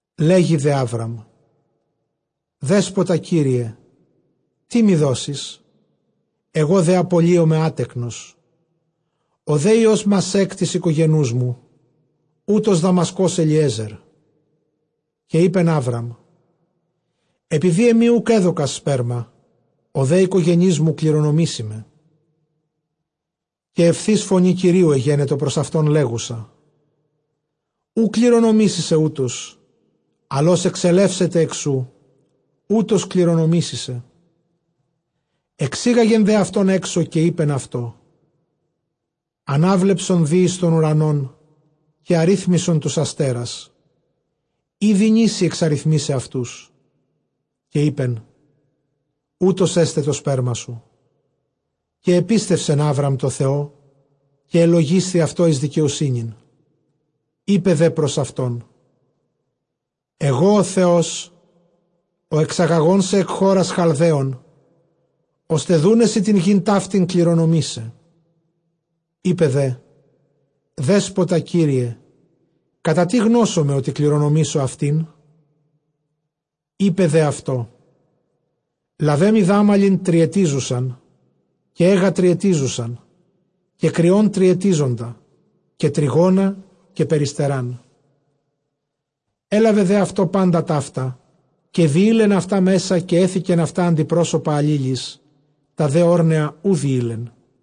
Δέγει δὲ Ἅβραμ, Δέσποτα Κύριε, τί μοι δώσεις; ἐγὼ δὲ ἀπολύομαι ἄτεκνος· ὁ δὲ υἱὸς Μασὲκ τῆς οἰκογενοῦς μου, οὗτος Δαμασκὸς Ἐλιέζερ. Καὶ εἶπεν Ἅβραμ, ἐπειδὴ ἐμοὶ οὐκ ἔδωκας σπέρμα, ὁ δὲ οἰκογενής μου κληρονομήσει με. Καὶ εὐθὺς φωνὴ Κυρίου ἐγένετο πρὸς αὐτὸν, λέγουσα, οὐ κληρονομήσει σε οὗτος· ἀλλʼ ὃς ἐξελεύσεται ἐκ σοῦ, οὗτος κληρονομήσει σε. Ἐξήγαγε δὲ αὐτὸν ἔξω, καὶ εἶπεν αὐτῷ, ἀνάβλεψον δὴ εἰς τὸν οὐρανὸν, καὶ ἀρίθμησον τοὺς ἀστέρας, εἰ δυνήσῃ ἐξαριθμῆσαι αὐτούς· καὶ εἶπεν, οὕτως ἔσται τὸ σπέρμα σου. Καὶ ἐπίστευσεν Ἅβραμ τῷ Θεῷ, καὶ ἐλογίσθη αὐτῷ εἰς δικαιοσύνην. Εἶπε δὲ πρὸς αὐτὸν, ἐγὼ ὁ Θεὸς ὁ ἐξαγαγών σε ἐκ χώρας Χαλδαίων, ὥστε δοῦναί σοι τὴν γῆν ταύτην κληρονομῆσαι. Εἶπε δέ, Δέσποτα Κύριε, κατὰ τί γνώσομαι, ὅτι κληρονομήσω αὐτήν; Εἶπε δὲ αὐτῷ, λάβε μοι δάμαλιν τριετίζουσαν, καὶ αἶγα τριετίζουσαν, καὶ κριὸν τριετίζοντα, καὶ τρυγόνα, καὶ περιστεράν. Ἔλαβε δὲ αὐτῷ πάντα ταῦτα, καὶ διεῖλεν αὐτὰ μέσα, καὶ ἔθηκεν αὐτὰ ἀντιπρόσωπα ἀλλήλοις· τὰ δὲ ὄρνεα οὐ διεῖλε.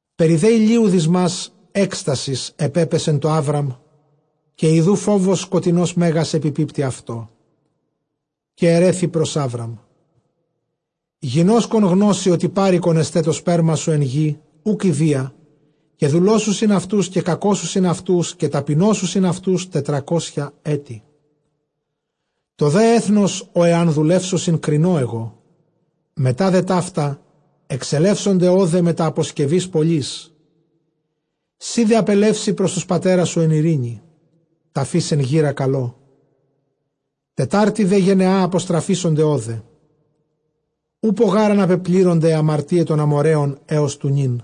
Περὶ δὲ ἡλίου δυσμὰς ἔκστασις ἐπέπεσε τῷ Ἅβραμ, καὶ ἰδοὺ φόβος σκοτεινὸς μέγας ἐπιπίπτει αὐτῷ. Καὶ ἐῤῥέθη πρὸς Ἅβραμ· γινώσκων γνώσῃ ὅτι πάροικον ἔσται τὸ σπέρμα σου ἐν γῇ οὐκ ἰδίᾳ, καὶ δουλώσουσιν αὐτοὺς, καὶ κακώσουσιν αὐτοὺς, καὶ ταπεινώσουσιν αὐτοὺς, τετρακόσια ἔτη. Τὸ δὲ ἔθνος, ᾧ ἐὰν δουλεύσωσι, κρινῶ ἐγώ· μετὰ δὲ ταῦτα, ἐξελεύσονται ὧδε μετὰ ἀποσκευῆς πολλῆς. Σὺ δὲ ἀπελεύσῃ πρὸς τοὺς πατέρας σου ἐν εἰρήνῃ, τραφεὶς ἐν γήρᾳ καλῷ. Τετάρτῃ δὲ γενεᾷ ἀποστραφήσονται ὧδε· οὔπω γὰρ ἀναπεπλήρωνται αἱ ἁμαρτίαι τῶν Ἀμοῤῥαίων ἕως τοῦ νῦν.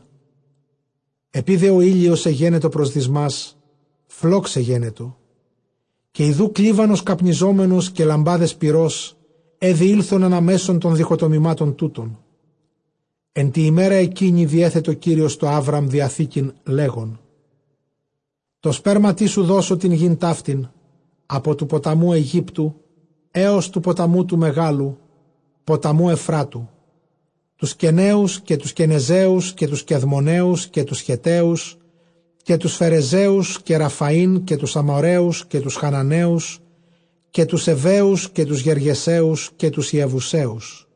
Ἐπεὶ δὲ ὁ ἥλιος ἐγένετο πρὸς δυσμὰς, φλὸξ ἐγένετο· καὶ ἰδοὺ κλίβανος καπνιζόμενος καὶ λαμπάδες πυρός, αἳ διῆλθον ἀνὰ μέσον τῶν διχοτομημάτων τούτων. Ἐν τῇ ἡμέρᾳ ἐκείνῃ διέθετο Κύριος τῷ Ἅβραμ διαθήκην, λέγων, τῷ σπέρματί σου δώσω τὴν γῆν ταύτην, ἀπὸ τοῦ ποταμοῦ Αἰγύπτου ἕως τοῦ ποταμοῦ τοῦ μεγάλου Εὐφράτου· Τοὺς Κεναίους, καὶ τοὺς Κενεζαίους, καὶ τοὺς Κεδμωναίους, καὶ τοὺς Χετταίους, καὶ τοὺς Φερεζαίους, καὶ τοὺς ʼΡαφαεὶν, καὶ τοὺς Ἀμοῤῥαίους, καὶ τοὺς Χαναναίους, καὶ τοὺς Εὐαίους, καὶ τοὺς Γεργεσαίους, καὶ τοὺς Ἰεβουσαίους.